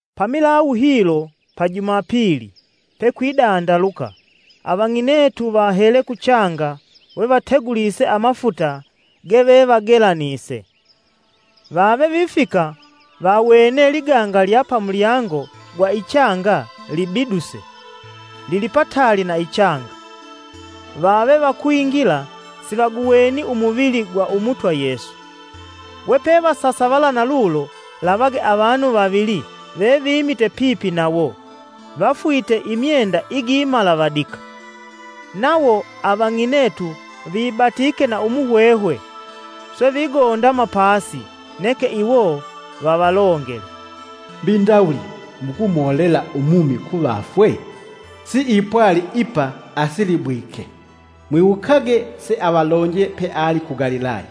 Pamilawu hilo pa Jumapili, pe kwidandaluka avang'inetu vahele kuchanga we vategulise amafuta gevevagelanise. Vave vifika vawene liganga lya pamulyango gwa ichanga libiduse, lilipataali na ichanga. Vave vakwingila sivaguweni umuvili gwa Umutwa Yesu. We pevasasavala na lulo, lavage avanu vavili vevimite pipi nawo vafwite imyenda igimalavadika. Nawo avang'inetu vibatike na umuhwehwe, swe vigondama pasi, neke iwo vavalongele, “Mbi ndawuli mukumolela umumi kuvafwe? Siipwali ipa, asilibwike; mwiwukage seavalonje peali ku Galilaya,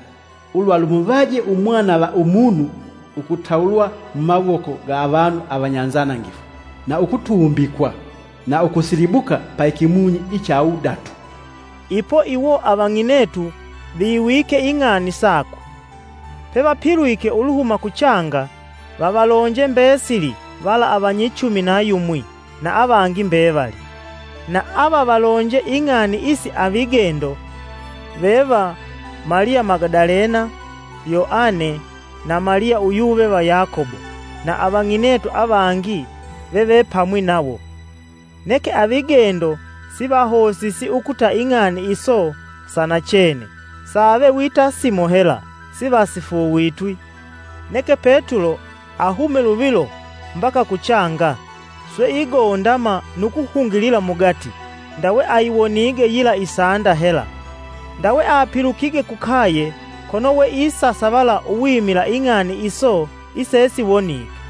‘Ulwa lumuvaje Umwana va Umunu ukutawulwa mumawoko ga avanu avanyanzanangifu, na ukutumbikwa, na ukusilibuka pa ikimunyi icha wudatu.’” Ipo iwo avang'inetu viwike ing'ani sakwe, pevapilwike uluhuma ku changa, vavalonje mbesili vala avanyichumi na yumwi na avangi mbevali. Na avavalonje ing'ani isi avigendo veva: Maliya Magadalena, Yoane na Maliya uyuve va Yakobo na avang'inetu avangi veve pamwi nawo. Neke avigendo sivahosisi ukuta ing'ani iso sa nachene, save wita simo hela sivasifuuvitwi. [ Neke Petulo ahume luvilo mbaka kuchanga, swe igondama nu kuhungilila mugati ndawe ayiwonige yila isanda hela. Ndawe apilukige kukaye kono we isasavala uwimila ing'ani iso isesiwonike.]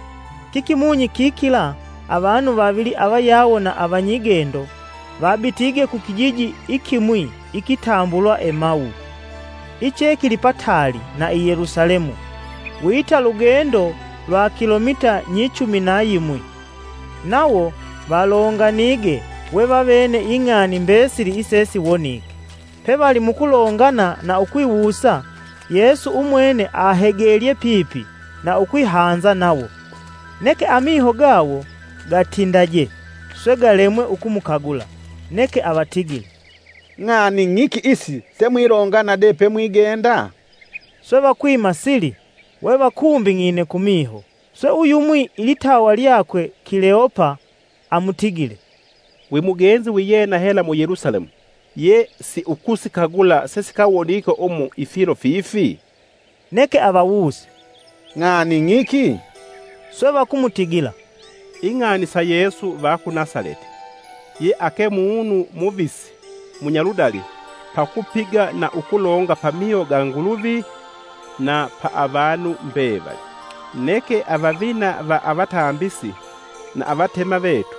Kikimunyi kikila avanu vavili avayawo na avanyigendo vabitige kukijiji ikimwi ikitambulwa Emawu, iche kilipataali na i Yelusalemu wita lugendo lwa kilomita nyichumi na yimwi. Nawo valonganige we vavene ing'ani mbesili isesiwonike. Pe vali mukulongana na ukwiwusa, Yesu umwene ahegelye pipi na ukwihanza nawo. Neke amiho gawo gatindaje swe galemwe ukumukagula. Neke avatigile, “Ng'ani ng'iki isi semwilongana de pemwigenda?” Swe vakwima sili, we vakumbing'ine kumiho. Swe uyumwi, ilitawa lyakwe Kileopa amutigile, “Wi mugenzi wiyena hela mu Yelusalemu ye siukusikagula sesikawonike umu ifilo fifi?” Neke avawuse, “Ng'ani ng'iki?” Swe vakumutigila, “Ing'ani sa Yesu va ku Nasaleti, ye ake munu muvisi munya ludali pakupiga na ukulonga pamiho ga Nguluvi na pa avanu mbevali. Neke avavina va avatambisi na avatema vetu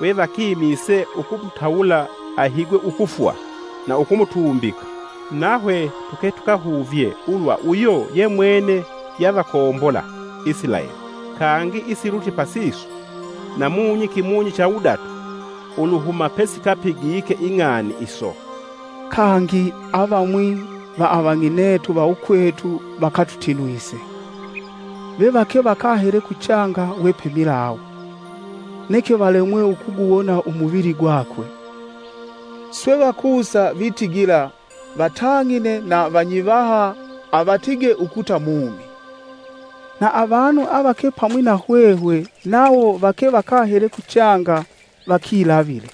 we vakimise ukumutawula ahigwe ukufwa, na ukumutumbika. Nahwe tuke tukahuvye ulwa uyo yemwene yavakombola Isilaeli. Kangi isilutye pasiso, namunyi cha wudatu uluhuma pesikapigike ing'ani iso. Kangi avamwi va avang'inetu va ukwetu vakatutinwise. Ve vake vakahele kuchanga we pemilawu, neke valemwe ukuguwona umuvili gwakwe. Swe vakusa vitigila vatang'ine na vanyivaha avatige ukuta mumi. Na avanu avake pamwi nahwehwe nawo vake vakahele kuchanga vakilavile,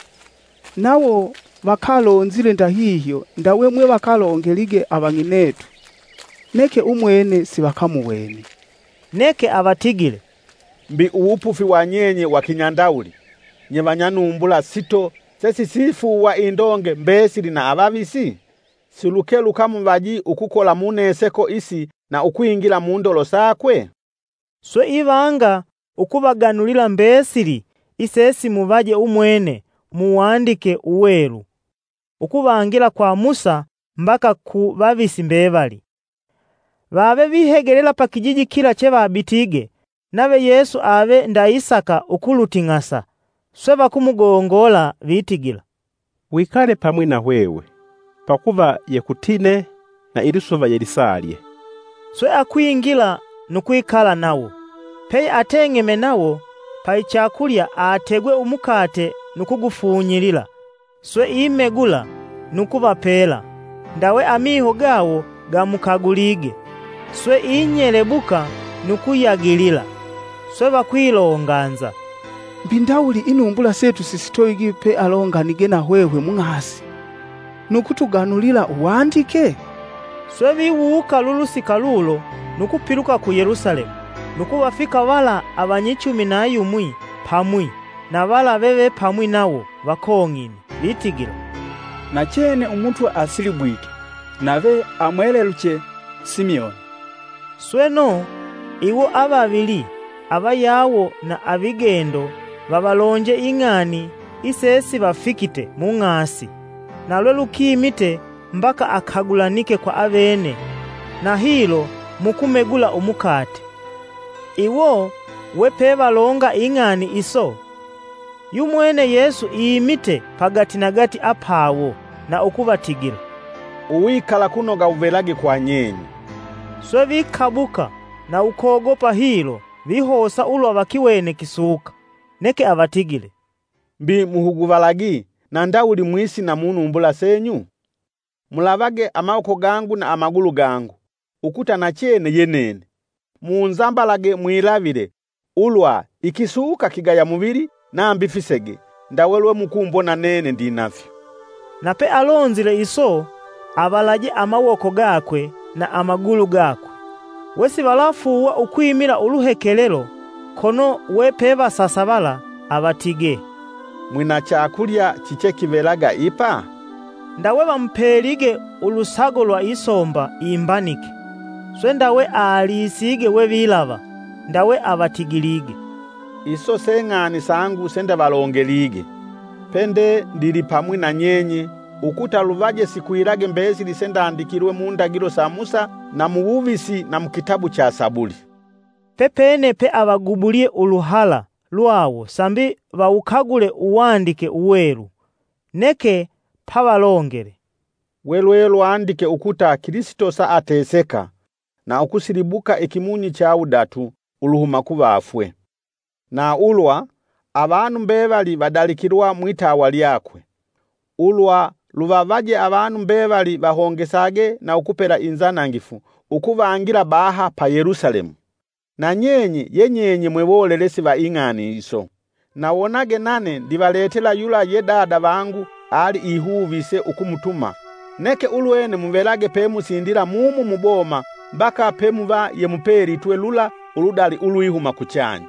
nawo vakalonzile ndahihyo ndawe mwe vakalongelige avang'inetu; neke umwene sivakamuweni.” Neke avatigile, “Mbi uwupufi wa nyenye wa kinyandawuli, nye vanya numbula sito sesisifuuwa indonge mbesili na avavisi? Siluke lukamuvaji ukukola mu neseko isi na ukwingila mundolo sakwe?” Swe ivanga ukuvaganulila mbesili isesimuvaje umwene Muwandike Uwelu, ukuvangila kwa Musa mbaka ku vavisi mbevali. Vave vihegelela pa kijiji kila chevabitige, nave Yesu ave ndaisaka ukuluting'asa; swe vakumugongola, vitigila, “Wikale pamwi na hwehwe, pakuva yekutine na ilisuva yelisalye.” Swe akwingila nu kwikala nawo. peye ateng'eme nawo paichakulya ategwe umukate nu kugufunyilila swe imegula, nu kuvapela. Ndawe amiho gawo gamukagulige, swe inyelebuka nu kuyagilila. Swe vakwilonganza, “Mbi ndawuli inumbula setu sisitovigi pealonganige nahwehwe mung'asi, nu kutuganulila Uwandike?” Swe viwuuka lulusika lulo nu kupiluka ku Yelusalemu, nu kuvafika vala avanyichumi na yumwi pamwi na vala veve pamwi nawo vakong'ine, vitigila, “Nachene Umutwa asilibwike nave amweleluche, Simioni.” Sweno, iwo avavili avayawo na avigendo vavalonje ing'ani isesivafikite mung'asi, na lwelukimite mbaka akagulanike kwa avene na hilo mukumegula umukate. Iwo vepe valonga ing'ani iso, yumwene Yesu imite pagatinagati apawo na ukuvatigila, “Uwikalakunoga wuvelage kwa nyenye.” Swe vikabuka na ukogopa hilo vihosa ulwa vakiwene kisuka. Neke avatigile, “Mbi muhuguvalagi, na ndawuli mwisina munumbula senyu? Mulavage amawoko gangu na amagulu gangu, ukuta nachene ye nene; munzambalage mwilavile ulwa ikisuka kigaya muvili nambi fisege ndawe lwe mukumbona nene ndinafyo.” Na pealonzile iso, avalaje amawoko gakwe na amagulu gakwe. We sivalafuuwa ukwimila uluhekelelo, kono we pevasasavala avatigee, “Mwina chakulya chichekivelaga ipa?” Ndawe vamupelige ulusago lwa isomba imbanike. Swe ndawe alisige we vilava. Ndawe avatigilige, “Iso se ng'ani sangu sendavalongelige, pende ndilipamwi na nyenye ukuta luvaje sikwilage mbesili sendandikilwe mu ndagilo sa Musa na muwuvisi na mukitabu cha Sabuli.” Pepene peavagubulye uluhala lwawo sambi vawukagule Uwandike Uwelu. Neke pavalongele, “We lwelwandike ukuta kilisito saateseka, na ukusilibuka ikimunyi cha wudatu uluhuma kuvafwe, na ulwa, avanu mbevali vadalikilwa mwitawa lyakwe, ulwa luvavaje avanu mbevali vahongesage na ukupela inzanangifu ukuvangila baha pa Yelusalemu. Na nyenye ye nyenye mwe wolelesi va ing'ani iso. Na wonage nane ndivaletela yula ye Dada vangu aliihuvise ukumutuma, neke ulwene muvelage pemusindila mumu muboma mbaka pemuva yemupelitwe lula uludali ulwihuma kuchanya.”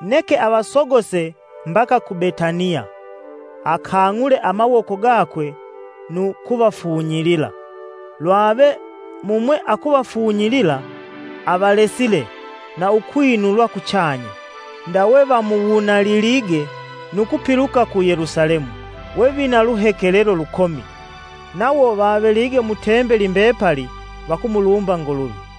Neke avasogose mbaka ku Betaniya, akang'ule amawoko gakwe nu kuvafunyilila. Lwave mumwe akuvafunyilila, avalesile na ukwinulwa kuchanya. ndawe vamuwunalilige, nu kupiluka ku Yelusalemu we vina luhekelelo lukomi; nawo vavelige mu tembeli mbepali vakumulumba Nguluvi.